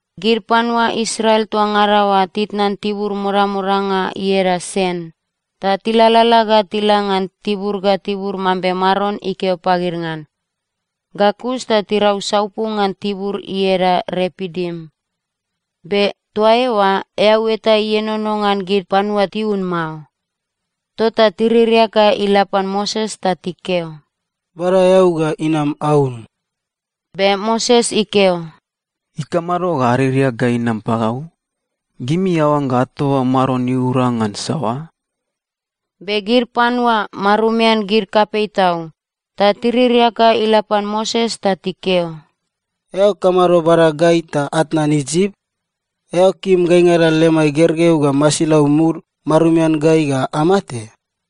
Gid panua Israel toa ngada oa titnan tibur modamodanga ieda Sen, ta tilalala ga tila ngan tibur ga tibur mambe Maron ikeo pagid ngan. Ga kus ta tirau saupu ngan tibur ieda Repidim. Be toa eoa eau eta ienono ngan gid panua tiun mao. Tota tiririak ga ila pan Moses ta tikeo, “Bada eau ga inam aun!” Be Moses ikeo, “Ikamado ga aririak ga inam pagau? Gimi aoangga atoba Maron iura ngan saoa?” Be gid panua marumian gid kapei tau, ta tiririak ga ila pan Moses ta tikeo, “Eao kamado bada gai ta atnan Isip? Eao kim gaingada lemai gergeu ga masilau mud marumian gai ga amate?”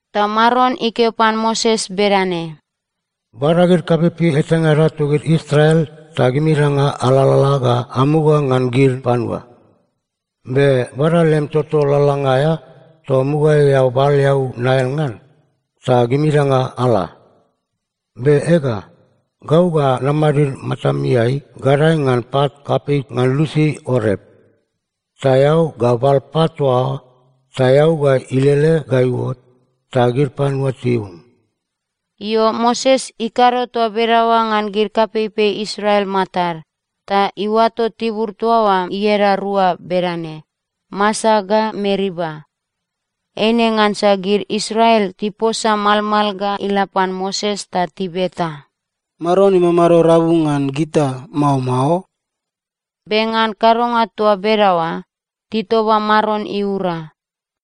Ta Maron ikeo pan Moses bedane, “Bada gid kapeipei etangada togid Israel ta gimingada alalala ga amuga ngan gid panua. Be bada lem toto lalalanga aea toa mugaeai eao bal eau Nail ngan, ta gimingada ala. Be ega, gau ga namadid matameai, gadae ngan pat kapei ngan lusi Orep. Ta eao ga bal pat toa oa, ta eau ga ilele ga iuot, ta gid panua tiun.” Io, Moses ikado toa bedaoa ngan gid kapeipei Israel matad. Ta iuato tibur toa oa ieda rua bedane: Masa ga Meriba. Eine ngansa gid Israel tiposa malmal ga ila pan Moses ta tibeta, “Maron imamado rabu ngan gita, mao mao?” Be ngan kadonga toa bedaoa, titoba Maron iura.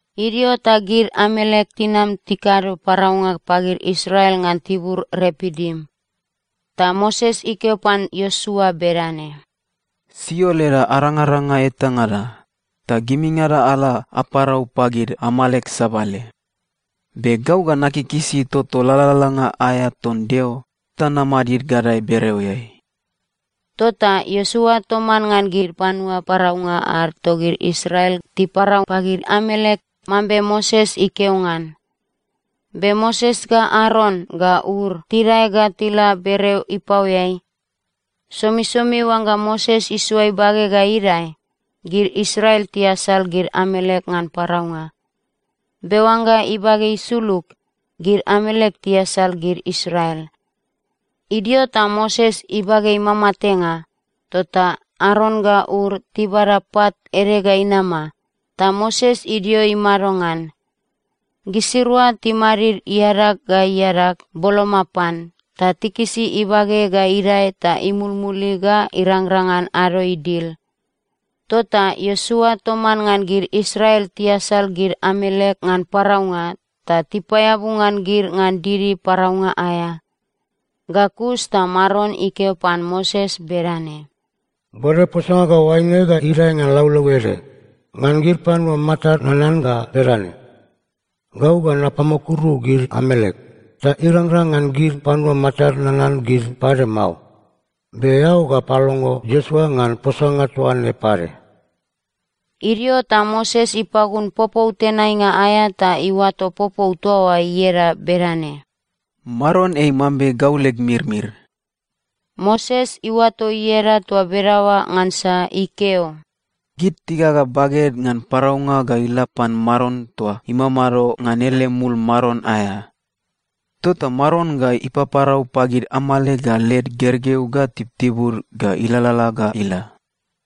Idio ta gid Amalek tinam tikado paraunga pagid Israel ngan tibur Repidim. Ta Moses ikeo pan Iosua bedane, “Sio leda arangaranga etangada, ta gimingada ala aparau pagid Amalek sabale. Be gau ga nakikisi toto lalalanga aea ton Deo ta namadid gadae bereoeai.” Tota Iosua toman ngan gid panua paraunga ad togid Israel tiparau pagid Amalek, mambe Moses ikeo ngan. Be Moses ga Aron ga Ur tidae ga tila bereo ipaoeai. Somisomi oangga Moses isoa ibage ga idae, gid Israel tiasal gid Amalek ngan paraunga. Be oangga ibage isulug, gid Amalek tiasal gid Israel. Idio ta Moses ibage imamatenga, tota Aron ga Ur tibada pat ede ga inama, ta Moses idio imado ngan. Gisirua timadid iadag ga iadag boloma pan, ta tikisi ibage ga idae ta imulmuli ga irangrang ngan ado idil. Tota Iosua toman ngan gid Israel tiasal gid Amalek ngan paraunga, ta tipaeabu ngan gid ngan didi paraunga aea. Ga kus ta Maron ikeo pan Moses bedane, “Bode posanga ga oaine ga idae ngan laulau ede, ngan gid panua matad nanan ga bedane, ‘Gau ga napamukuru gid Amalek, ta irangrang ngan gid panua matad nanan gid pade mao.’ Be eao ga palongo Iosua ngan posanga toaine pade.” Idio ta Moses ipagun popou tenainga aea ta iuato popou toa oa ieda bedane, “Maron ei mambe gau leg mirmir.” Moses iuato ieda toa bedaoa ngansa ikeo, “Gid tigaga baged ngan paraunga ga ila pan Maron toa imamado ngan ele mul maron aea. Tota Maron ga ipaparau pagid Amalek ga led gergeu ga tibutibud ga ilalala ga ila.”